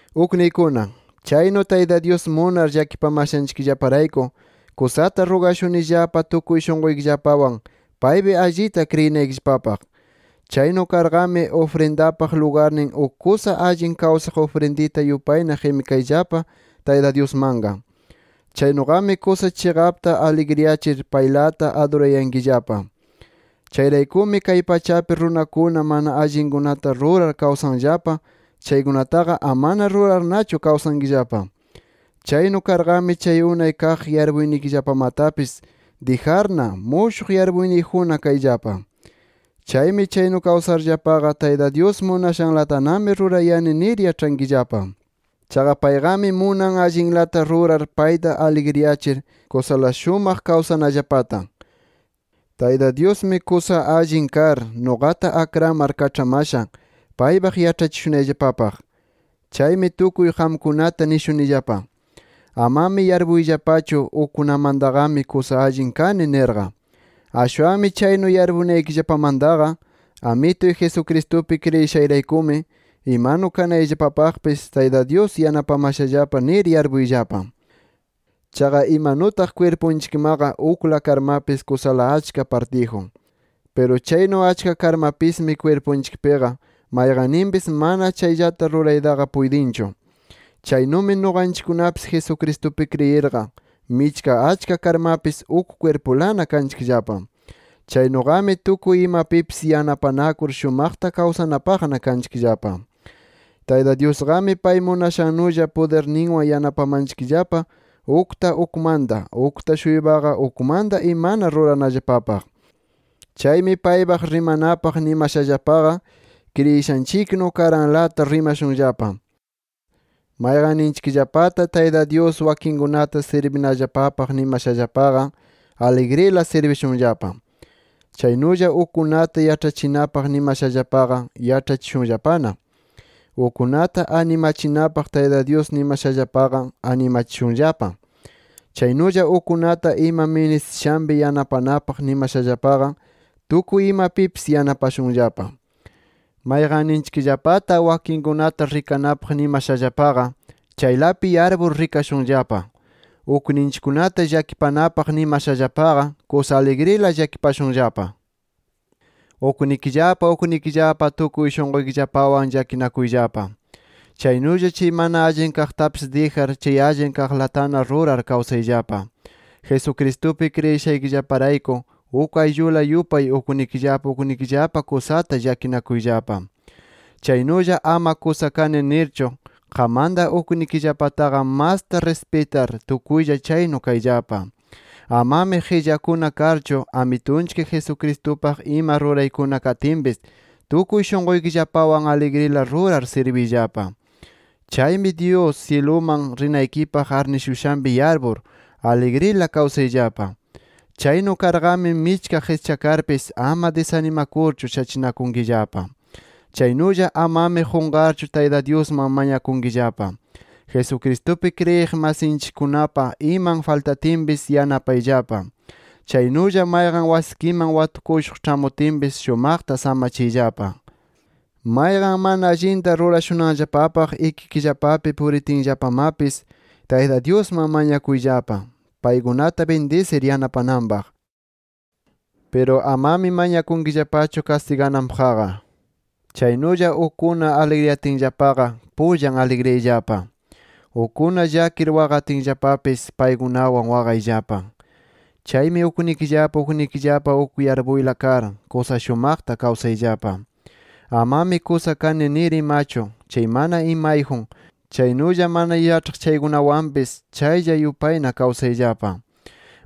Ukniykuna, chaynu Tayta Dyus munar llakipamashanchikllaparayku, kusata rugashunillapa tukuy shunquykillapawan paypi allita kriyinaykillapapaq. Chaynu karqami, ufrindapaq lugarnin uk kusa allin kawsaq ufrindita yupayna qimikayllapa Tayta Dyusmanqa. Chaynuqami, kusa chiqapta aligriyachir paylata adurayankillapa. Chayraykumi kay pachapi runakuna mana allinkunata rurar kawsanllapa chaykunataqa, amana rurarnachu kawsankillapa. Chaynu karnaqami chay unay kaq yarpuynikillapamatapis dijarna, mushuq yarpuyniyjunna kayllapa. Chaymi chaynu kawsarllapaqa, Tayta Dyus munashanlatami rurayani nir yaĉhankillapa. Chaqa payqami munan allinlata rurar payta aligriyachir, kusala shumaq kawsanallapata. Tayta Dyusmi kusa allin kar, nuqata akramar kaĉhamasha, paypaq yaĉhachishunayllapapaq. Chaymi tukuy qamkunata nishunillapa: Amami yarpuyllapachu ukkunamantaqami kusa allin kani, nirqa. Ashwanmi chaynu yarpunaykillapamantaqa Amituy Jesucristupi kriyishayraykumi imanu kanayllapapaqpis Tayta Dyus yanapamashallapa nir yarpuyllapa. Chaqa imanutaq kwirpunchikmaqa ukla karmapis kusala achka partiyjun. Piru chaynu achka karmapismi kwirpunchikpiqa mayqanninpis mana chayllata ruraytaqa puytinchu. Chaynumi nuqanchikkunapis Jesucristupi kriyirqa, michka achka karmapis, uk kwirpulana kanchikllapa. Chaynuqami, tukuy imapipis yanapanakur, shumaqta kawsanapaqna kanchikllapa. Tayta Dyusqami pay munashannulla pudirninwan yanapamanchikllapa ukta ukmanta, ukta-shuypaqa ukmanta imana ruranallapapaq. Chaymi paypaq rimanapaq nimashallapaqa, kriyishanchiknu karanlata rimashunllapa. Mayqanninchikllapata Tayta Dyus wakinkunata sirbinallapapaq nimashallapaqa, aligrila sirbishunllapa. Chaynulla ukkunata yaĉhachinapaq nimashallapaqa, yaĉhachikushunllapana. Ukkunata animachinapaq Tayta Dyus nimashallapaqa, animachishunllapa. Chaynulla ukkunata ima ministishanpi yanapanapaq nimashallapaqa, tukuy imapipis yanapashunllapa. Mayqanninchikllapata wakinkunata rikanapaq nimashallapaqa, chaylapi yarpur rikashunllapa. Ukninchikkunata llakipanapaq nimashallapaqa, kusa aligrila llakipashunllapa. Uknikillapa uknikillapa tukuy shunquykillapawan llakinakuyllapa. Chaynulla chay mana allin kaqtapis dijar, chay allin kaqlatana rurar kawsayllapa. Jesucristupi kriyishaykillaparayku, uk ayllula yupay uknikillapa uknikillapa kusata llakinakuyllapa. Chaynulla ama kusa kani nirchu, qammanta uknikillapataqa masta rispitar, tukuylla chaynu kayllapa. Amami qillakuna karchu, Amitunchik Jesucristupaq ima ruraykuna katinpis, tukuy shunquykillapawan aligrila rurar sirbiyllapa. Chaymi, Dyus syiluman rinaykipaq arnishushanpi yarpur, aligrila kawsayllapa. Chaynu karqami michka qischakarpis, ama disanimakurchu shachinakunkillapa. Chaynulla amami qunqarchu Tayta Dyusman mañakunkillapa. Jesucristupi kriyiq masinchikkunapa iman faltatinpis yanapayllapa. Chaynulla mayqan wasikiman watukushuq ĉhamutinpis, shumaqta samachiyllapa. Mayqan mana allinta rurashunanllapapaq ikikillapapi puritinllapamapis, Tayta Dyusman mañakuyllapa, paykunata bindisir yanapananpaq. Piru amami mañakunkillapachu kastigananpaqqa. Chaynulla ukkuna aligriyatinllapaqa, pullan aligriyayllapa. Ukkuna llakir waqatinllapapis, paykunawan waqayllapa. Chaymi uknikillapa uknikillapa uk yarpuyla kar, kusa shumaqta kawsayllapa. Amami kusa kani nir imachu, chay mana imayjun, chaynulla mana yaĉhaq chaykunawanmapis, chaylla yupayna kawsayllapa.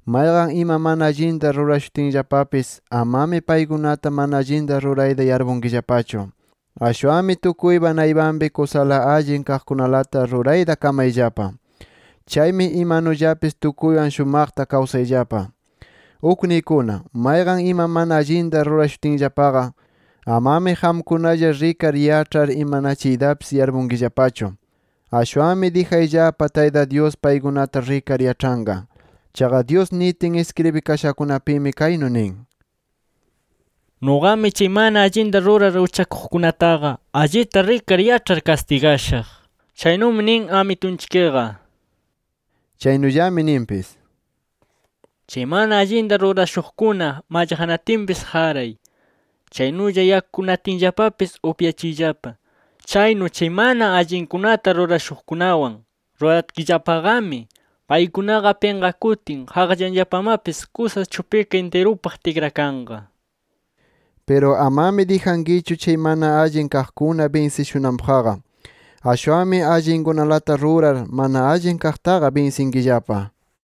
Mayqan ima mana allinta rurashutinllapapis, amami paykunata mana allinta rurayta yarpunkillapachu. Ashwanmi tukuypa naypanpi kusala allin kaqkunalata rurayta kamayllapa. Chaymi imanullapis tukuywan shumaqta kawsayllapa. Ukniykuna, mayqan ima mana allinta rurashutinllapaqa, amami qamkunalla rikar yaĉhar imanachiytapis yarpunkillapachu. Ashwanmi dijayllapa Tayta Dyus paykunata rikar yaĉhanqa. Chaqa Dyus nitin iskribikashakunapimi kaynu nin: “Nuqami chay mana allinta rurar uchakuqkunataqa allita rikar yaĉhar kastigashaq”. Chaynumi nin Amitunchikqa. Chaynullami ninpis: “Chay mana allinta rurashunaqkuna mallaqnatinpis, qaray. Chaynulla yakunatinllapapis, upyachiyllapa. Chaynu chay mana allinkunata rurashuqkunawan ruratkillapaqami, paykunaqa pinqakutin qaqllanllapamapis kusa chupika intirupaq tikrakanqa” nir. Piru amami dijankichu, chay mana allin kaqkuna binsishunanpaqqa. Ashwanmi allinkunalata rurar, mana allin kaqtaqa binsinkillapa.